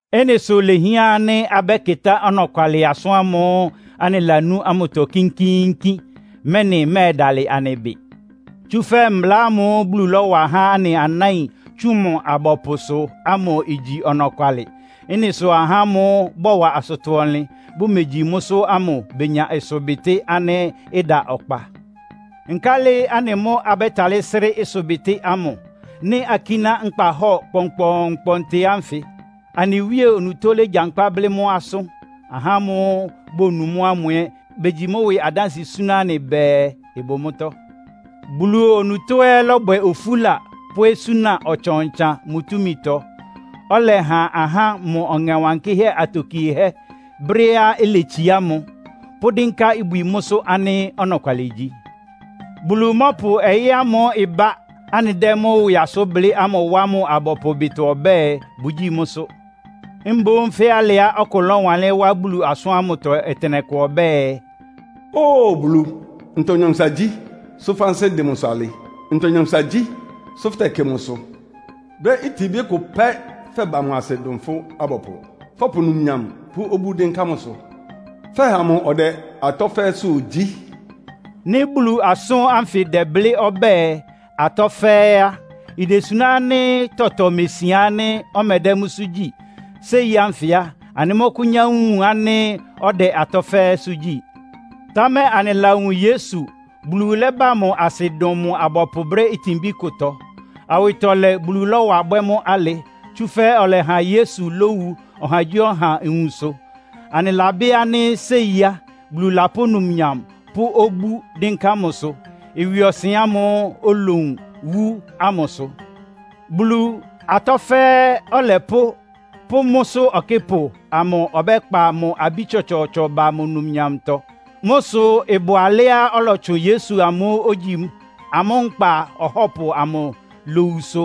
Ɩ́nɩ sʋ ilehián ánɩ́ abɛ́kɩtá ɔnɔkwalɩ asʋ́n ámʋ́ʋ́ anɩlanú ámʋtɔ kínkíínkín, mɛ́nɩ ɩmɛ́ɛdalɩ anɩ ɩbɩ. Tsúfɛ́ mbla ámʋ́ʋ́ Bulu lɔ́wa há anɩ anáin tsʋn mʋ abɔpʋsʋ ámʋ igyi ɔnɔkwalɩ. Ɩ́nɩ sʋ ahá ámʋ́ʋ́ bɔwa asʋtɔ-ɔnlɩn, bʋmegyi mʋ́sʋ́ ámʋ benya ɩsʋbɩtɩ́ ánɩ́ ɩda ɔkpa. Nkálɩ anɩ mʋ́ abɛ́talɩ́ srɩ́ ɩsʋbɩtɩ́ ámʋ, nɩ́ akíná nkpahɔ́ɔ kpɔnkpɔɔnkpɔntɩ ánfɩ? Anɩ Wíe onutó légyankpá blɩ́ mʋ́ asʋ́n. Ahá ámʋ́ʋ́ bonu mʋ́ ámʋ ɛ́ begyi mʋ́ ɩwɩ adánsɩɛ súná anɩ bɛɛ, ɩbʋ mʋ́tɔ́. Bulu onutó ɛ́ lɔ́bwɛ ofúla pʋ́ osúna ɔtsan-ɔtsan mʋ túmitɔ, ɔlɛha ahá mʋ Ɔŋɛ Wankɩ́hɛ́ atokiehɛ́ brɛ́á iletsiá mʋ, pʋ́dɩ́nká ibwi mʋ́sʋ́ ánɩ́ ɔnɔkwalɩ igyi. Bulu mɔ́pʋ ɔyɩ́ ámʋ́ʋ́ ɩbá, anɩdɛ́ mʋ́ ɩwɩ asʋ́n blɩ́ ámʋ wá mʋ abɔpʋ ɩbɩtɔ ɔbɛ́ɛ, bʋgyíi mʋ́sʋ́. Mboún fɛ́ alɩá ɔkʋ lɔ́wanlɩ́n wá Bulu asʋ́n ámʋtɔ ɔtɩnɛkʋ ɔbɛ́ɛ, “Óo Bulu, ntɔ nyankpʋsa gyí, sʋ́ fʋ́ ansɩ́ ɩdɩn mʋsʋ alɩ? Ntɔ nyankpʋsa gyí, sʋ fʋ́tɛkɩ mʋsʋ? Brɛ́ itinbí kʋtɔ pɛ́ fɛba mʋ asɩ dʋn fʋ́ abɔpʋ. Fɔpʋ numnyam pʋ́ obú dɩ́nká mʋsʋ, fɛha mʋ ɔdɛ atɔ́ fɛ́ɛ́sʋ́ gyí.” Nɩ́ Bulu asʋ́n ánfɩ dɛ́blɩ́ ɔbɛ́ɛ, “Atɔ́ fɛ́ɛ́” á, idesuná ánɩ́ tɔtɔ mesian ánɩ́ ɔmɛdɛ́ mʋ́sʋ́ gyí. Séi ánfɩ á, anɩmɔ́kʋ́nyá wun ánɩ́ ɔdɛ atɔ́ fɛ́ɛ́sʋ́ gyí. Támɛ anɩlawun Yesu. Bulu lɛ́ba mʋ asɩ dʋn mʋ abɔpʋ brɛ́ itinbí kʋtɔ. Awɩtɔlɛ Bulu lɔ́wa bwɛ́ mʋ́ alɩ, tsúfɛ́ ɔlɛha Yesu lówu ɔhagyíɔha nwunsʋ. Anɩlabɩ́ ánɩ́ séi á, Bulu lapʋ́ numnyam pʋ́ obú dɩ́nká mʋsʋ, ɩwɩɔsɩn ámʋ́ʋ́ olowun, wú ámʋ sʋ. Bulu, atɔ́ fɛ́ɛ́ Ɔlɛpʋ́ pʋ́ mʋ́sʋ́ Ɔkɩ́pʋ amʋ ɔbɛ́kpa mʋ abí tsɔtsɔɔtsɔ ba mʋ numnyamtɔ. Mʋ́ sʋ ɩbʋ alɛ́á ɔlɔtsʋn Yesu amʋ́ʋ́ ogyi amʋ́ Nkpa Ɔhɔ́pʋ amʋ lowusʋ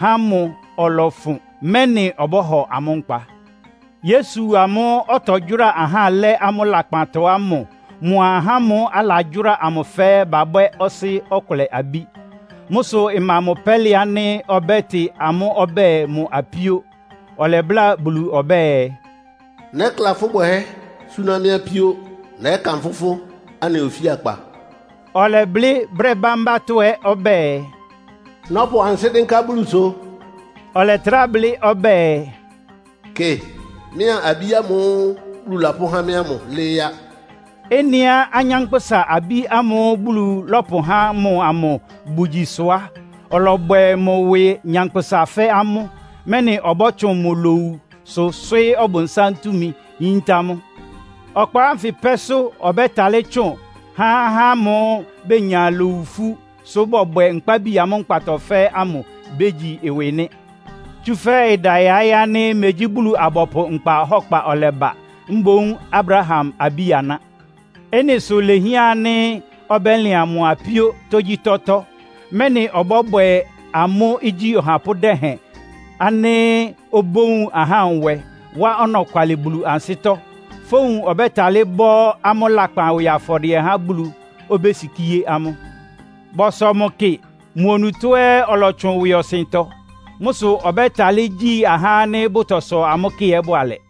há mʋ ɔlɔfʋn, mɛ́nɩ ɔbɔ́hɔ amʋ́ nkpa. Yesu amʋ́ʋ́ ɔtɔgyʋ́ráa ahá lɛ́ amʋ́ lakpantɔ ámʋ mʋa ahá ámʋ́ʋ́ alagyʋ́ra amʋ fɛ́ɛ́ babwɛ́ Ɔsɩ́ ɔkʋlɛ abí. Mʋ́ sʋ ɩma mʋ pɛ́lɩ ánɩ́ ɔbɛ́tɩ amʋ́ ɔbɛ́ɛ mʋ apíó. Ɔlɛbláa Bulu ɔbɛ́ɛ, “Nɛ́kla fʋ́ bwɛhɛ́ súná mɩ́ apíó. Nɛ́kanfʋ́ fʋ́ anɩ ofíakpa.” Ɔlɛblɩ́ brɛ́ bámbátɔ́ ɛ́ ɔbɛ́ɛ, “Nɔ́pʋ ansɩ́ dɩ́nká Bulusʋ.” Ɔlɛtrá blɩ́ ɔbɛ́ɛ, “Kɩ, mɩ́a abí ámʋ́ʋ́ Bulu lapʋ́há mɩ́ ámʋ lɩ́ɩ́ á.” Ɩ́nɩá anyánkpʋ́sa abí ámʋ́ʋ́ Bulu lɔ́pʋhá mʋ amʋ bʋgyi sʋ á, ɔlɔbwɛ mʋ ɩwɩ nyankpʋsa fɛ́ amʋ́, mɛ́nɩ ɔbɔ́tsʋn mʋ lowusʋ swɩ́ɩ́ Ɔbʋnsám túmi, yíntá mʋ. Ɔkpa ánfɩ pɛ́sʋ́ ɔbɛ́talɩ́ tsʋn há ahá ámʋ́ʋ́ benya lowu ifú, sʋ bɔbwɛ nkpábi amʋ́ nkpatɔ fɛ́ɛ́ ámʋ bégyi ɩwɩ nɩ́. Tsúfɛ́ ɩda yaɩ́ ánɩ́ megyí Bulu-abɔpʋ nkpa ɔhɔ́kpa ɔlɛba, mboún Abraham abí-aná. Ɩ́nɩ sʋ ilehián ánɩ́ ɔbɛ́lɩan mʋ apíó tógyítɔ́tɔ́, mɛ́nɩ ɔbɔ́bwɛ amʋ́ igyí ɔhapʋ́ dɛhɛn ánɩ́ obówun ahá nwɛ, wá ɔnɔkwalɩ Bulu ansɩ́tɔ́. Fówun ɔbɛ́talɩ́ bɔ́ amʋ́ lakpan ɩwɩ afɔdɩɛ há Bulu, obésikíé amʋ́. Bɔsɔ mʋ kɩ, mʋ onutó ɛ́ ɔlɔtsʋn ɩwɩɔsɩntɔ. Mʋ́ sʋ ɔbɛ́talɩ́ gyí ahá ánɩ́ bʋtɔsɔ amʋ́ kɩ ɛ́ bʋalɛ.